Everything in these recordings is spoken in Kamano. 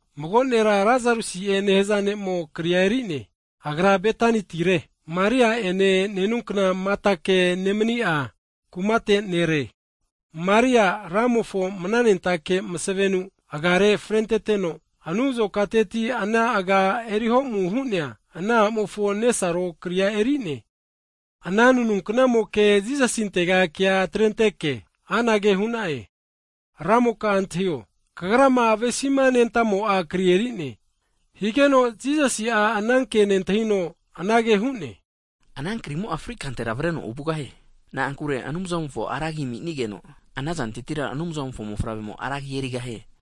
Mago nera Lasarusi'e nehza ne'mo kri eri'ne. Agra Betanitire, Maria ene nenunkna Matake nemni'a kumate nere. Maria Ramofo mananentake masavenu agare frenteteno, anu azokateti ana aga eri ho'mu hu'nea a'mofo nesaro kria eri'ne. Ana nanunkna'moke Jisasintega kea atrenteke, anage hu'na'e, Ramoka antahio, Kagrama avesima nentamo'a kri eri'ne. Higeno Jisasi'a ana ke nentahino, anage hu'ne, Ana krimo'a fri kantera avreno ovugahie, na'ankure Anumzamofo ra agi ami'nigeno, ana zantetira Anumzamofo Mofavremo ra agi erigahie.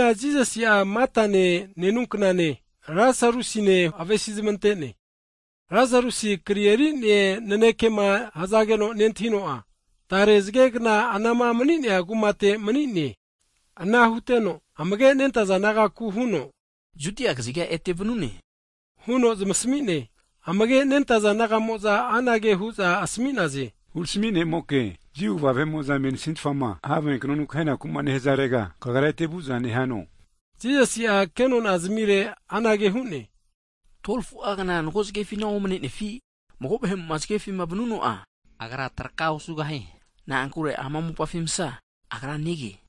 Jisasi'a Matane nenunknane, Lasarusine avesizamante'ne. Lasarusi kri eri'ne nanekema hzageno nentahino'a, tare zge'gna anama mani'nea kumate mani'ne. Ana huteno amage'nentaza disaipol nagaku huno, Judia kaziga ete vanu'ne huno zamasmi'ne. Amage' nentaza disaipol nagamo'za anage hu'za asmi'naze, Hurami ne'moke (Rabbi), Jiu kva vahe'mo'za mensitfama have knonu kahenaku nehzarega, Kagra ete vu'za nehano? Jisasi'a kenona zamire anage hu'ne, 12fu'a kna (aua) mago zgefina omne'nefi? Mago vahe'mo'ma zge ferupima vanuno'a agra traka osugahie, na'ankure ama mopafi msa agra nege.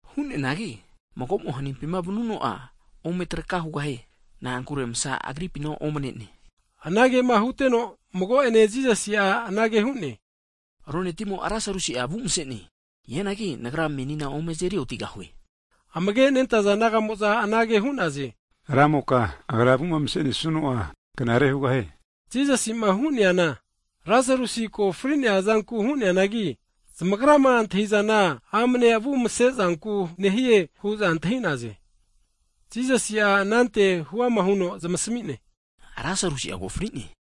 Hu'neanagi mago'mo hanimpima vanuno'a ome traka hugahie, na'ankure msa agripina omne'ne. Anagema huteno, mago'ene Jisasi'a anage hu'ne, ronetimo Lasarusi'a avu mse'ne, hianagi menina Nagra ome azeri otigahue. Amage nentaza disaipol nagamo'za anage hu'naze, Ramoka, agra avu'ma mse'nesuno'a, knare hugahie. Jisasi'ma hu'neana, Lasarus ko fri'nea zanku hu'neanagi, zamagrama antahizana amne avu mse'zanku nehie hu'za antahi'naze. Jisasi'a anante huama huno zamasmi'ne, Lasarusi'a ko fri'ne,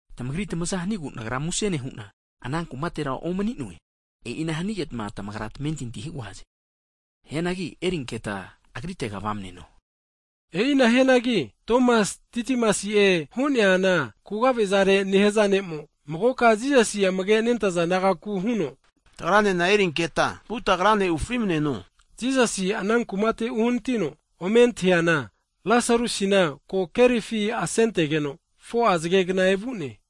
Tamagri tamaza hanigu Nagra muse nehu'na, ana kumatera omni'noe, e'ina hanigeta tamagra tamentinti hugahaze. Hianagi erinketa agritega vamneno. E'ina hianagi Tomasi (Didimasi'e hu'neana kugavezare) nehaza ne'mo, magoka Jisasi amage nentaza disaipol nagaku huno, tagranena erinketa vuta Agrane ufri'maneno hu'ne. Jisasi ana kumate uhnatino, ome antahiana Lasarusina ko kerifi asentageno, 4'a zgegna evu'ne.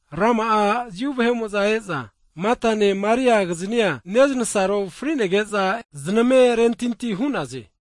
Rama'a Jiu vahe'mo'za e'za Matane Maria kiznia, neznasaro fri'negeza e'za zname rentinti hu'naze.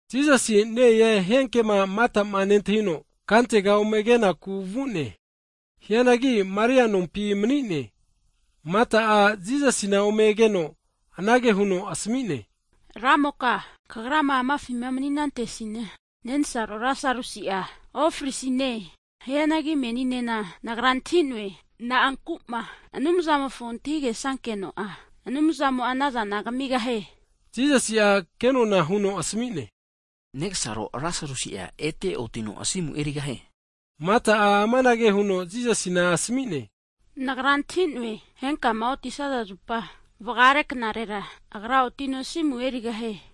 Jisasi ne-e hia kema Matama nentahino, kantega ome kenaku vu'ne. Hianagi Maria'a nompi mani'ne. Mata'a, Jisasina ome keno anage huno asmi'ne, Ramoka, Kagrama amafima mani'nantesina, nensaro Lasarusi'a ofrisine. Hianagi meninena nagra antahi'noe, na'anku'ma Anumzamofo antahige'sankeno'a, Anumzamo'a anazana kmigahie. Jisasi'a kenona huno asmi'ne, negsaro Lasarusi'a ete otino asimu erigahie. Mata'a amanage huno Jisasina asmi'ne, nagra antahi'noe, henkama otisaza zupa vgare knarera, agra otino asimu erigahie.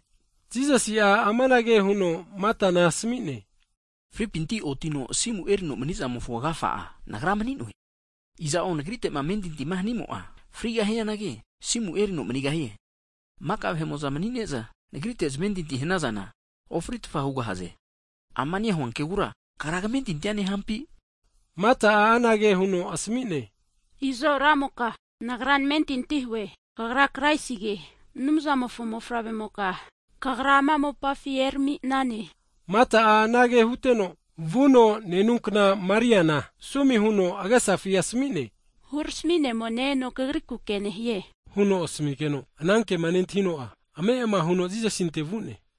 Jisasi'a amanage huno Matana asmi'ne, Fripinti otino asimu erino mani'zamofo agafa'a Nagra mani'noe, iza'o Nagrite'ma amentinti hanimo'a, frigahianagi asimu erino manigahie. Maka vahe'mo'za mani'neza Nagrite zamentinti hanazana, ofri'tfa hugahaze. Amama nehua kegura kagra kmentintia nehampi? Mata'a anage huno asmi'ne, izo Ramoka, nagra namentinti hue, Kagra Kraisige, Anumzamofo mofavre'moka Kagra ama mopafi erami'nane. Mata'a anage huteno, vuno nenunkna Mariana sumi huno agesafi asmi'ne, Hurami ne'mo ne-eno kagriku ke nehie, huno asmi'geno, ana kema nentahino'a, ame' huno Jisasinte vu'ne.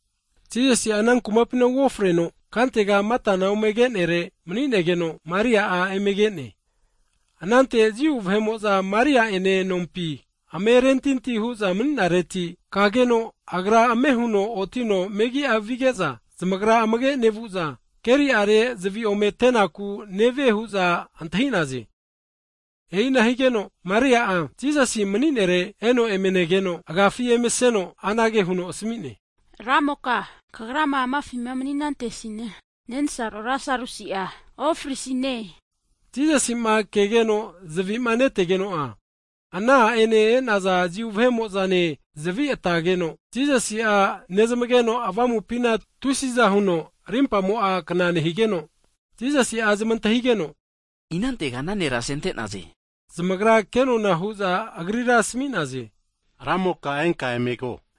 Jisasi'a ana kumapina uofreno, kantega Matama omege'nere mani'negeno, Maria'a emege'ne. Anante Jiu vahe'mo'za Maria'ene nompi ame rentinti hu'za mani'nareti, kageno'ma agra ame' huno otino megi'a vige'za, zamagra amage nevu'za, keri'are zvi ome ate'naku nevie hu'za antahi'naze. E'ina higeno, Maria'a Jisasi mani'nere eno eme negeno, agiafi emaseno, anage huno asmi'ne, Ramoka Kagrama amafi mani'nantesina, nensaro Lasarusi'a ofrisine. Jisasima kegeno zavi'ma netegeno'a, ana a'ene e'naza Jiu vahe'mo'zane zvi atageno, Jisasi'a nezmageno avamupina tusi'za huno rimpamo'a kna nehigeno, Jisasi'a zamantahigeno, inantega ana nera asente'naze? Zamagra kenona hu'za Agrira asmi'naze, Ramoka enka emego.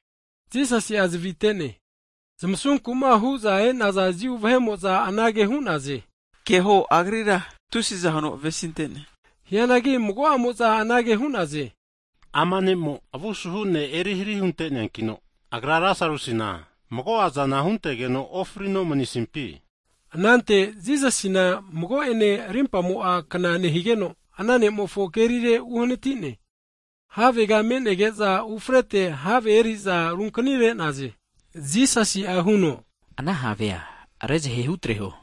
Jisasi'a zvi' ate'ne. Zamasuma ragiku'ma e'naza Jiu vahe'mo'za anage hu'naze, Keho agrira tusi'za huno avesinte'ne! Hianagi mago'amo'za anage hu'naze, ama ne'mo avu suhu ne' eri hari hunte'neankino, Agra Lasarusina mago'a zana huntegeno ofrino manisimpi? Anante Jisasi mago'ene, rimpamo'a kna nehigeno ana ne'mofo kerire uhanati'ne. Havega me'nege'za ufrekantera have eri'za runkani re'naze. Jisasi'a hunoana have rezahe hutreho,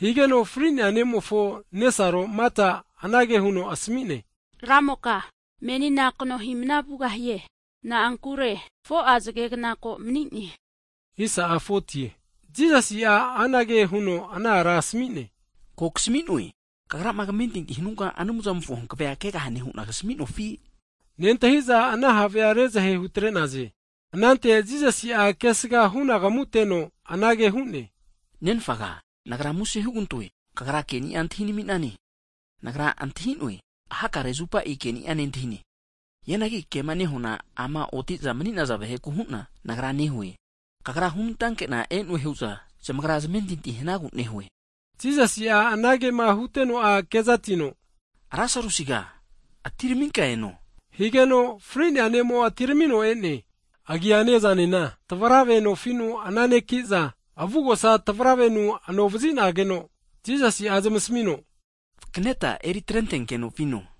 higeno fri'nea ne'mofo nesaro Mata anage huno asmi'ne, Ramoka, menina kno hi'mana vugahie, na'ankure 4'a zgegna ko mani'ne. Jisasi'a anage huno ana ara asmi'ne, Ko kasmi'noe, kagrama kmentinti hnunka Anumzamofo hankve'a (glori) kegahane hu'na kasmi'nofi? Nentahi'za ana have rezahe hutre'naze. Anante Jisasi'a kesga hunagamuteno, anage hu'ne, Nenfaga, Nagra muse hugantoe, Kagra ke'nia antahi nami'nane. Nagra antahi'noe, hakare zupa keni'a nentahine, hianagi kema nehuana ama oti'za mani'naza vaheku hu'na Nagra nehue, Kagra hunantake'na e'noe hu'za zamagra zamentinti hanagu nehue. Jisasi'a anagema huteno'a, kezatino Lasarusiga, atiraminka eno! Higeno fri'nea ne'mo atiramino e'ne, agiane, azanena, tavrave nofi'nu ana'neki'za, avugosa tavravenu anovazinageno Jisasi'a zamasmino, Tavarave'a vakneta eri atrenkeno vino.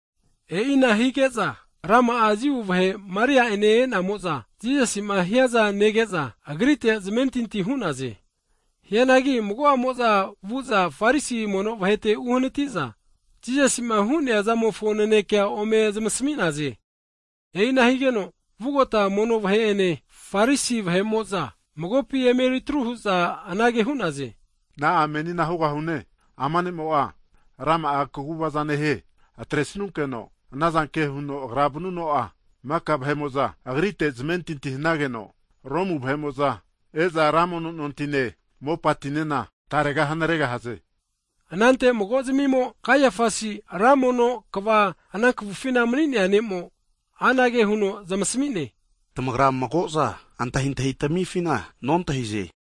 E'ina hige'za, rama'a Jiu vahe Maria'ene e'namo'za, Jisasi'ma hiaza nege'za, Agrite zamentinti hu'naze. Hianagi mago'amo'za vu'za Farisi mono vahete uhnati'za, Jisasi'ma hu'nea zamofo naneke ome zamasmi'naze. E'ina higeno, vugota mono vahe'ene (Sanhedrin), Farisi vahe'mo'za magopi eme atru hu'za anage hu'naze, Na'a menina hugahune? Ama ne'mo'a rama'a kaguvaza nehie. Atresnunkeno anazanke huno Agra vaniana, maka vahe'mo'za Agrite zamentinti hanageno, Romu vahe'mo'za e'za ra mono nontine, mopatinena tarega hanaregahaze. Anante mago'zmimo, Kaiafasi ra mono kva (hai pris) ana kafufina mani'nea ne'mo, anage huno zamasmi'ne, tamagra mago'za antahintahitamifina nontahize.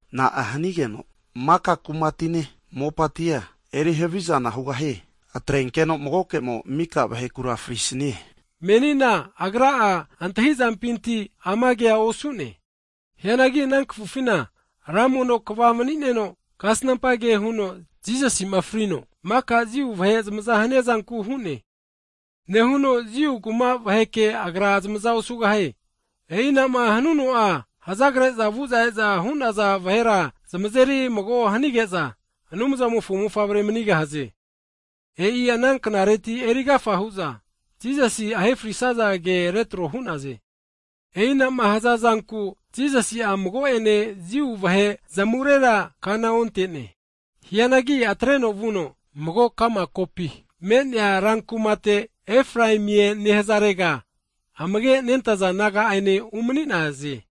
Na'a hanigeno maka kumatine, mopatia eri havizana hugahie? Atrenkeno magoke'mo miko vahekura frisnie. Kazafasi'a agra antahi'zampinti ama kea osu'ne, hianagi ana kafufina ran mono kva (hai pris) mani'neno, kasnampa ke huno Jisasima frino maka Jiu vahe zamaza hania zanku hu'ne, Nehuno Jiu kuma vaheke Agra zamaza osugahie, e'inama hanuno'a hazagre'za vu'za e'za hu'naza vahera zamazeri mago hanige'za Anumzamofo mofavre manigahaze. E'i ana knareti erigafa hu'za, Jisasi ahe frisaza ke retro hu'naze. E'inama hazazanku Jisasi'a mago'ene Jiu vahe zamurera kana onte'ne. Hianagi atreno vuno mago ka'ma kokampi me'nea rankuma kaziga Efraimie nehazarega amage' nentaza naga'ane umani'naze.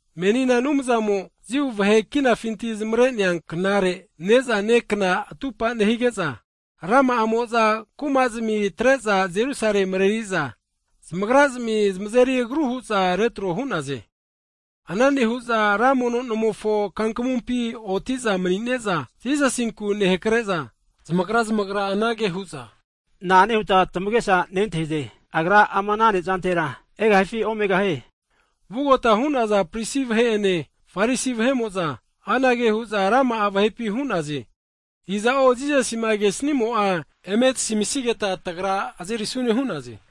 Menina Anumzamo Jiu vahe kinafinti zamare'nea knare (Pasova) ne'za ne kna atupa nehige'za, rama'amo'za kuma'zmi atre'za Jerusale mreri'za, ne'za nesagu zamagrazmi zmazeri agru huza retro hu'naze. Ana nehu'za ra mono nomofo (tempol) kumapi oti'za mani'neza Jisasinku nehakre'za, zamagra zamagra anage hunaze. Na'ane hutma tamage'sa nentahize? Agra ama (Pasova) nezantera egahifi, omegahie? Vugota hu'naza prisi vahe'ene, Farisi vahe'mo'za, anage hu'za rama'a vahepi hu'naze, iza'o Jisasima kesimo'a, eme tasamisigeta tagra azerisune hu'naze.